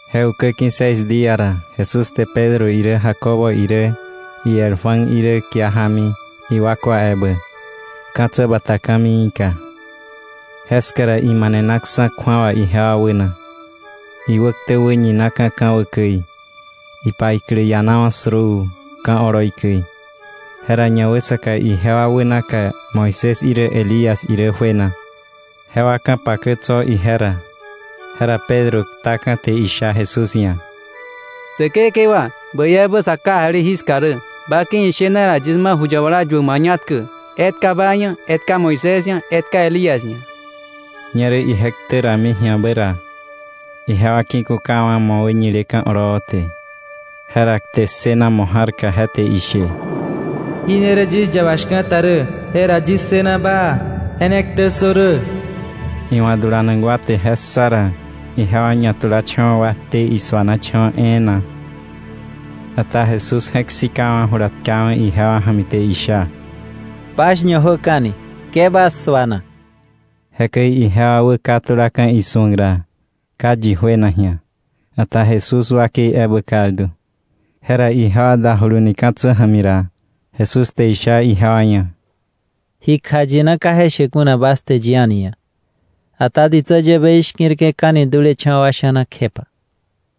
Je ukä ki̱ seis día ra, Jesús te Pedro irä Jacobo irä iel Juan irä kia jámi iwakwa ebä, ka̱tsä bata ka̱miika. Jeska ra imanenaksa̱ kju̱awa ijewa wäna. Iwäktä wäñinaka̱ ka̱wä käi, ipaiklä ianawa̱ suruu ka̱ oloi käi. Jera ñawäsaka ijewa wänaka Moisés irä Elías irä juena, jewa ka̱pakä tso̱ ije ra. Jera Pedro ktaka̱ te isha Jesús ia̱: —Säkekewa, ¡bäi ebä sa kajali jiska rä! Ba ki̱ ishena ra, yis ma ju yabala yuäk mañatkä: etka ba ia̱, etka Moisés ia̱, etka Elías ia̱. Ñerä ije ktä rami ji̱abä ra, ijewa ki̱kukawa̱ mo̱ wäñileka̱ oloo te. Jera kte ssëna mo̱ ja̱rka, je te ishe: “Jí ne rä yis yaba shka̱ta rä, je ra yis ssëna baa. Je ne ktä ssö rä.” Iwa̱ dulanak wa te je ssa ra, ijewa ñatulacha̱wa̱ wakte, isuanacha̱wa̱ e̱e̱na. Ata Jesús je̱k sikawa̱, jula tkawa̱ ijewa ja̱mi te isha: —Bas ñajöka̱ni, ke bas suana. Jekäi ijewa wäkatulaka̱ isu̱ak ra, ka yi juena ji̱a; ata Jesús wakei ebä kaldu. Jera ijewa dajuluni ka̱tsä ja̱mi ra, Jesús te isha ijewa ia̱: —Ji kjayina ka je she kuna bas te yi a̱ni ia̱; ata ditsä yäbei shki̱rke̱ka̱ni dulecha̱wa̱ wa sha̱na kjepa.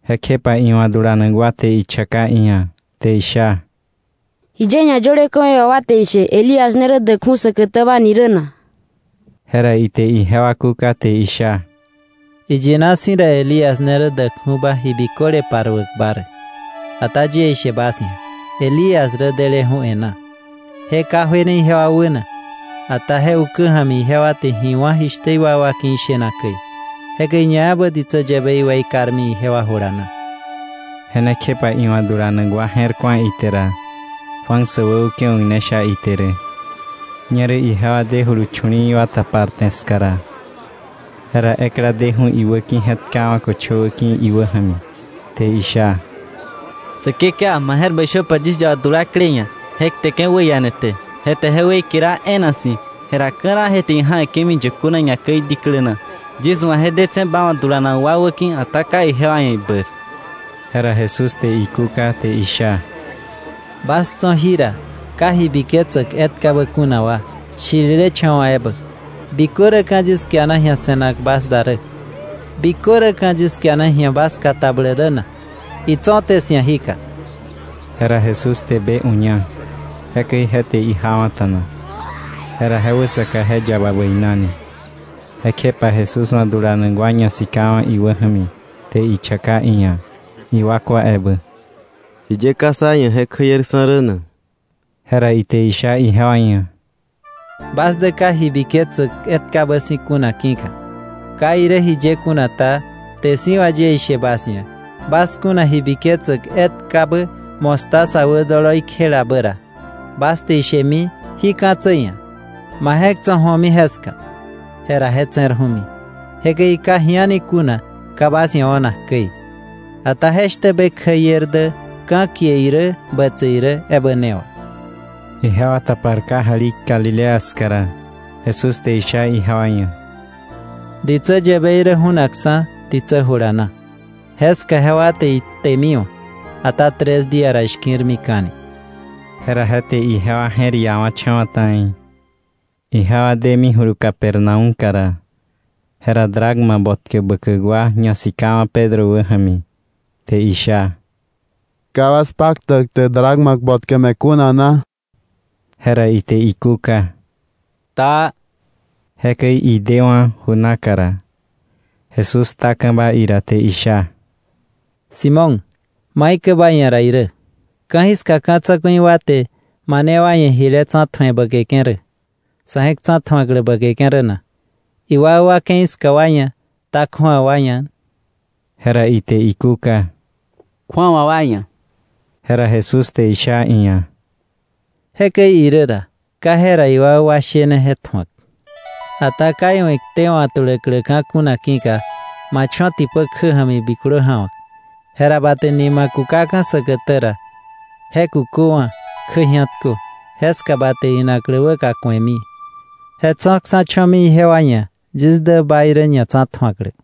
Jekjepa iwa̱ dulanak wa te ichaka iia̱, te isha: —¿Jiye ñayöle ka̱wei wà wa te ishe Elías ne rä däkju̱ säkätäba ni rä na? Jera ite ijewa kúka, te isha: —Iyina si̱ ra, Elías ne rä däkju̱ba ji biköle paruäkba rä. Ata yie ishe bas ia̱, Elías rä deleju̱ e̱ná, je ka juene ijewa wäna, ata je ukä ja̱mi ijewa te ji wá̱ jishtä iwakwa ki̱ ishena käi. Jekäi ñaebä ditsä yäbei weikarmi ijewa jula na. Je ne kjepa iwa̱ dulanak wa je̱r ku̱a ite ra, Juan säwäukewa̱k ne sha ite rä. Ñerä ijewa dejulu chu̱li̱i̱ wa taparte ska ra, jera ekla deju̱ iwäki̱, je̱tkawa̱ köchowä ki̱ iwä ja̱mi, te isha: —Säkekewa, ma je̱r bäi shöpa yis yaba dulaklei ia̱; je kteke̱ wäiane te, je te je weikerawa̱ e̱e̱na si̱; jera ka̱raa je te ija̱we̱ke̱mi yökö na, ñakäi diklä naka. Yis wa̱ je detse̱ ba wa̱ dulanak wa wäki̱, ata ka ijewa ia̱ ibäir. Jera Jesús te ikúka te isha: —¡Bas tso̱ jira wa ka ji biketsäk etkabä kuna, shirilecha̱wa̱ ebä! ¿Bikö räka̱ yis kiana ji̱a se̱nak bas da rä? ¿Bikö räka̱ yis kiana ji̱a bas katabläk rä na? Itso̱té 'sia̱ jika. Jera Jesús te be uña, jekäi je te ijawa̱ta̱na. Jera je wäsaka je yaba bäinani. Jekjepa Jesús wa̱ dulanak wa ñasikawa̱ iwä ja̱mi te ichaka iia̱ iwakwa ebä: —¿Jiye ka sá ia̱ je kjäierksa̱ rä na? Jera ite isha ijewa ia̱: —Bas dä ka ji biketsäk etkabä si̱ kuna ki̱ka. Ka irä jiye kuna ta, kte si̱ wà yie ishe bas ia̱, bas kuna ji biketsäk etkabä mostaza wä doloi kjelabä ra, bas te ishemi jí ka̱tsä ia̱: ‘Ma je̱k tso̱ ju̱omi jeska’, jera je tse̱rju̱mi. Jekäi ka ji a̱ni kuna ka bas ia̱ o̱nak käi. Ata jeshtä be kjäier dä ka̱kie irä bätse irä ebä ne wà. Ijewa tapar kajali Galilea ska ra, Jesús te isha ijewa ia̱: —Ditsä yäbei rä ju̱nakksa̱ ditsä jula na; jeska jewa te iktemiwa̱, ata tres día ra ishki̱rmika̱ni. Jera je te ijewa je̱r iawa̱cha̱wa̱ ta̱i. Ijewa demijulu Capernaúmka ra, jera dracma botkä bäkäk wa ñasikawa̱ Pedro wä ja̱mi te isha: —¿Ka bas paktäk te dracma botkä me̱ kuna na? Jera ite ikúka: —Taa. Jekäi idewa̱ ju naka ra, Jesús ktaka̱ba ira te isha: —Simón, ¿maikäi ba ia̱ ra irä? ¿Ka̱jiska ka̱ tsa̱ku̱i wa te mane wa ia̱ jile tsa̱tju̱e bäkeke̱ rä, sa̱ je̱k tsa̱tju̱aklä bäkeke̱ rä na; iwakwa ke̱i ska wa ia̱, ta kju̱awa wa ia̱? Jera ite ikúka: —Kju̱awa wa ia̱. Jera Jesús te isha iia̱: —Jekäi irä ra, ka jera iwakwa shene je tju̱ak. Ata ka iwa̱ iktewa̱ tuläkläka̱ kuna ki̱ka, ma cho̱ tipä kjä ja̱mi biklö ja̱wa̱k. Jera ba te nima kukaka̱ säkätä ra, je kuköwa̱, kjä ji̱atkö; jeska ba te inaklä wäka ku̱emi. Je tso̱ksa̱, cho̱mi ijewa ia̱ yis dä ba irä ñatsa̱tju̱aklä.